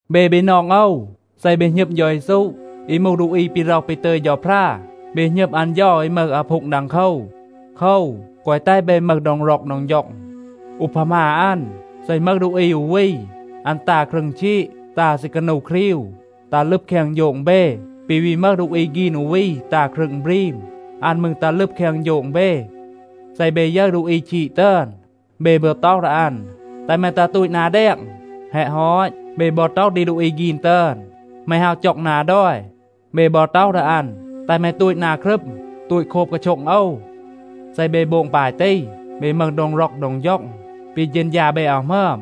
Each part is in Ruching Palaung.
เบ บีนอง โอว, เซ เบ หณึม เฌา เยซู, อี มูห ดูอี ปี ร็อห ปี ตึย เฌาพรา, เบ หณึม อัน เฌา อี มึห อาพูง ดังโคว. โคว, แกวะ แตห เบ มึห โดง ร็อก โดง ฌ็อง. อูพามา อัน, เซ อึณ มึห ดูอี อู วี, อัน ตา ครึง ชีด, ตา ซีกานู ครีว, ตัห ลึบ แคง โฌง เบ, ปี วี มึห ดูอี ฆีน อู วี ตา ครึง บรีม, อัน มืร ตัห ลึบ แคง โฌง เบ. เซ เบ ยึร ดูอี ชีด ตึอน, เบ บอ ต็อห ดี อัน, “แตห แม ตัห ตูต นา แดง.” แฮะ ฮอต, เบ บอ ต็อห ดี ดูอี ฆีน ตึอน, “แม ฮาว จ็อง นา ดอย.” เบ บอ ต็อห ดี อัน, “แตห แม ตูต นา ครึม, ตูต โคบ กาโช็ง โอว.” เซ เบ โบง ปาย ตี, เบ มึห โดง ร็อก โดง ฌ็อง. ปี เฌณฌา เบ อาว หมึอม.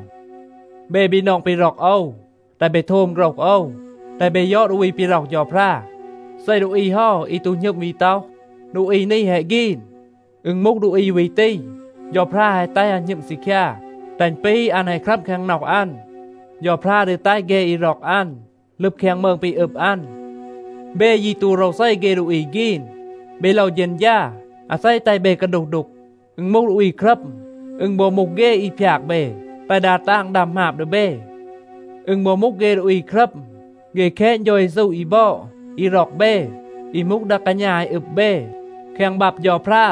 เบ บีนอง ปี ร็อก โอว, แตห เบ โทม โฆรห โอว. แตห เบ ยอด ดูอี ปี ร็อห เฌาพรา. เซ ดูอี เฮา, อี ตู หณึม วี ต็อห, ดูอี นี แฮะ ฆีน, อึณ มูห ดูอี วี ตี, เฌาพรา แฮะ แตห อัน หณึม ซีคยา, แตห อึณ ปี อัน แฮะ ครัม แคง น็อห อัน. เฌาพรา ดี แตห เฆ อี ร็อก อัน ลึบ แคง มืง ปี อึบ อัน. เบ ยี ตู โรวเซ เฆ ดูอี ฆีน. เบ โลว เฌณฌา, อาเซ แตห เบ กาดูห ดูก. อึณ มูห ดูอี ครัม. อึณ บอ มูห เฆ, อี พยาก เบ, แตห ดา ตาง ดัม หมาบ ดี เบ. อึณ บอ มูห เฆ ดูอี ครัม, เฆ แคณ เฌา เยซู อี บอด, อี ร็อก เบ, อี มูห ดา กาณา อี อึบ เบ. แคง บับ เฌาพรา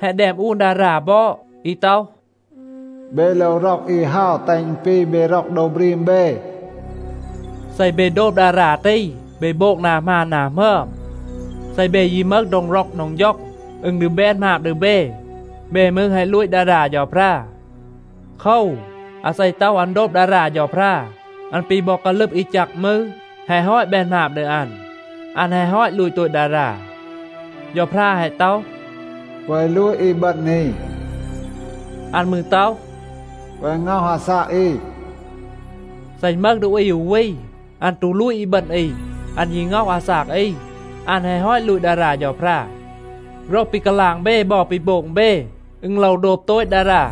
แฮะ แดม อูน ดารา บอด อี ต็อห, “เบ โลว ร็อก อี เฮา, แตห อึณ ปี เบ ร็อก โดว บรีม เบ.” เซ เบ โดบ ดารา ตี, เบ โบง นา หมาน นา หมึอม. เซ เบ ยี มึห โดง ร็อก โดง ฌ็อง, อึณ ดี แบน หมาบ ดี เบ. เบ มืร แฮะ ลูต ดารา เฌาพรา. โคว, อาเซ ต็อห อัน โดบ ดารา เฌาพรา, อัน ปี บอ กาลึบ อี แจก มืร, แฮะ ฮอต แบน หมาบ ดี อัน. อัน แฮะ ฮอต ลูต โตต ดารา. เฌาพรา แฮะ ต็อห, “แกวะ ลูต อีบึณ อี.” อัน มืร ต็อห, “แกวะ ง็อห อาซาก อี.” เซ อึณ มึห ดูอี อู วี, อัน ตู ลูต อีบึณ อี, อัน ยี ง็อห อาซาก อี, อัน แฮะ ฮอต ลูต ดารา เฌาพรา. โฆรห ปี กาลาง เบ บอ ปี โบง เบ, อึณ โลว โดบ โตต ดารา,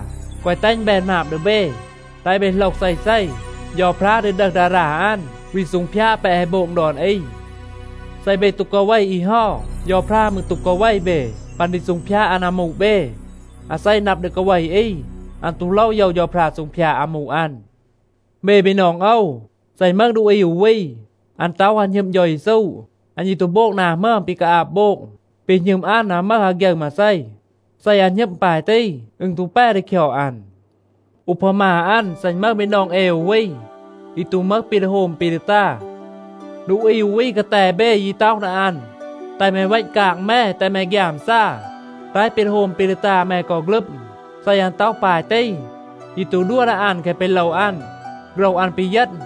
แกวะ แตห อึณ แบน หมาบ ดี เบ. แตห เบ โหลห เซเซ, เฌาพรา ดี ดึห ดารา อัน, วี ซูงพยาด แปะ แฮะ โบง ดอน อี. เซ เบ ตู กาเว อี เฮา, เฌาพรา มืร ตู กาเว เบ ปัน ดี ซูงพยาด อัน อามู เบ. อาเซ นับ ดี กาเว อี, อัน ตู โลว โยว เฌาพรา ซูงพยาด อามู อัน. เบ บีนอง โอว, เซ อึณ มึห ดูอี อู วี, อัน ต็อห อัน หณึม เฌา เยซู, อัน ยี ตู โบง นา หมึอม ปี กาอาบ โบง, ปี หณึม อัน อาว มึห อาฆยึร มาเซ. เซ อัน หณึม ปาย ตี, อึณ ตู แป ดี คยอด อัน. อูพามา อัน, เซ อึณ มึห บีนอง เอ อู วี, อี ตู มึห ปี ดี โฮม ปี ดี ตา, ดูอี อู วี กาแต เบ ยี ต็อห ดี อัน, “แตห แม เวณ กาง แม, แตห แม ฆยามซา. แตห ปี ดี โฮม ปี ดี ตา แม กอ ฆลึม.” เซ อัน ต็อห ปาย ตี, ยี ตู ดัว ดี อัน แคะ ปี โลว อัน, โฆรห อัน ปีเยณ.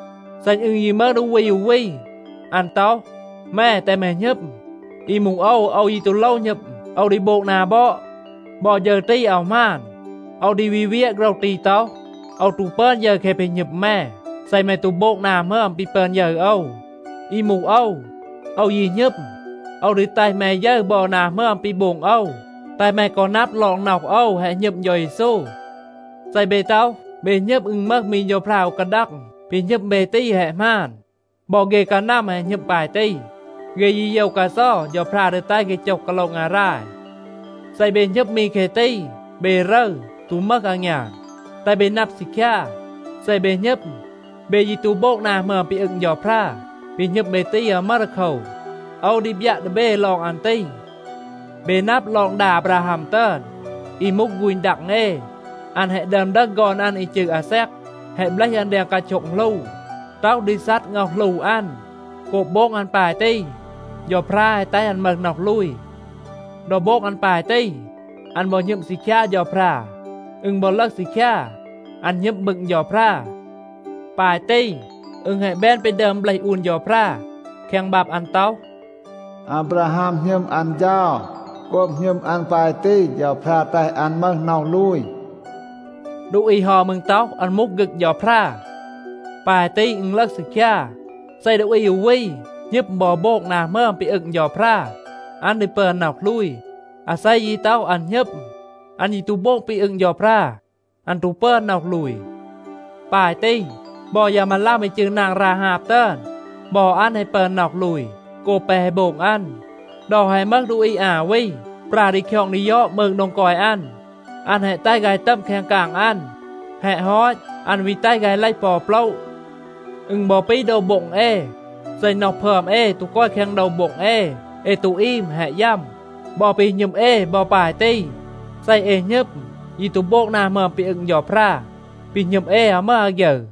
เซ อึณ ยี มึห ดูอี อู วี, อัน ต็อห, “แม, แตห แม หณึม. อี มูห โอว, โอว ยี ตู โลว หณึม. โอว ดี โบง นา บอด,” บอ ฌึร ตี อาว หมาน. โอว ดี วี เวียะ โฆรห ตี ต็อห, “โอว ตู ปึอน ยึร แคะ ปี หณึม แม เซ แม ตู โบง นา หมึอม ปี ปึอน ยึร โอว. อี มูห โอว, โอว ยี หณึม. โอว ดี แตห แม ยึร บอ นา หมึอม ปี โบง โอว, แตห แม กอ นับ ลอง น็อห โอว แฮะ หณึม เฌา เยซู.” เซ เบ ต็อห, เบ หณึม อึณ มึห มี เฌาพรา อู กาดัง, ปี หณึม เบ ตี แฮะ หมาน. บอ เฆ กานัม แฮะ หณึม ปาย ตี. เฆ ยี โยว กาเซา เฌาพรา ดี แตห เฆ โจห กาโละ งาราย. เซ เบ หณึม มี แคะ ตี, เบ รึร, ตู มึห อางยาน. แตห เบ นับ ซีคยา, เซ เบ หณึม, เบ ยี ตู โบง นา หมึอม ปี อึง เฌาพรา, ปี หณึม เบ ตี อาว มึห ดีโคว. โอว ดี บยัะ ดี เบ ลอง อัน ตี. เบ นับ ลอง ดา อาบราฮัม ตึอน, อี มูห ฆูณ ดัง เอ. อัน แฮะ ดึอม ดึห ฆอน อัน อี จืร อาแซก, แฮะ เบลห อัน แดง กาโช็ง หลู, ต็อห ดี ซัด ง็อห หลู อัน. โกบ โบง อัน ปาย ตี, เฌาพรา แฮะ แตห อัน มึห น็อห ลูย. ดอ โบง อัน ปาย ตี อัน บอ หณึม ซีคยา เฌาพรา. อึณ บอ ลึห ซีคยา, อัน หณึม บึง เฌาพรา. ปาย ตี, อึณ แฮะ แบน ปี ดึอม เบลห อูน เฌาพรา แคง บับ อัน ต็อห, “อาบราฮัม หณึม อัน เฌา. โกบ หณึม อัน ปาย ตี, เฌาพรา แตห อัน มึห น็อห ลูย.” ดูอี เฮา มืร ต็อห, อัน มูห ฆึก เฌาพรา. ปาย ตี อึณ ลึห ซีคยา, เซ ดูอี อู วี หณึม บอ โบง นา หมึอม ปี อึง เฌาพรา, อัน ดี ปึอน น็อห ลูย. อาเซ ยี ต็อห, อัน หณึม, อัน ยี ตู โบง ปี อึง เฌาพรา, อัน ตู ปึอน น็อห ลูย. ปาย ตี บอ ยา มาลัม อี จืร นาง ราฮาบ ตึอน, บอ อัน แฮะ ปึอน น็อห ลูย โกบ แปะ แฮะ โบง อัน. ดอ แฮะ มึห ดูอี อา วี ปรา ดี คยอง ดี ยอด มืง โดง กอย อัน. อัน แฮะ แตห ฆาย ตัม แคง กาง อัน. แฮะ ฮอต, อัน วี แตห ฆาย เลห ปอ อู โปละ. อึณ บอ ปี โดว โบ็ง เอ. เซ น็อห พึอม เอ ตู กอย แคง โดว โบ็ง เอ, เอ ตู อีม, แฮะ ยัม. บอ ปี หณึม เอ บอ ปาย ตี. เซ เอ หณึม, ยี ตู โบง นา หมึอม ปี อึง เฌาพรา, ปี หณึม เอ อาว มึห อาฆยึร.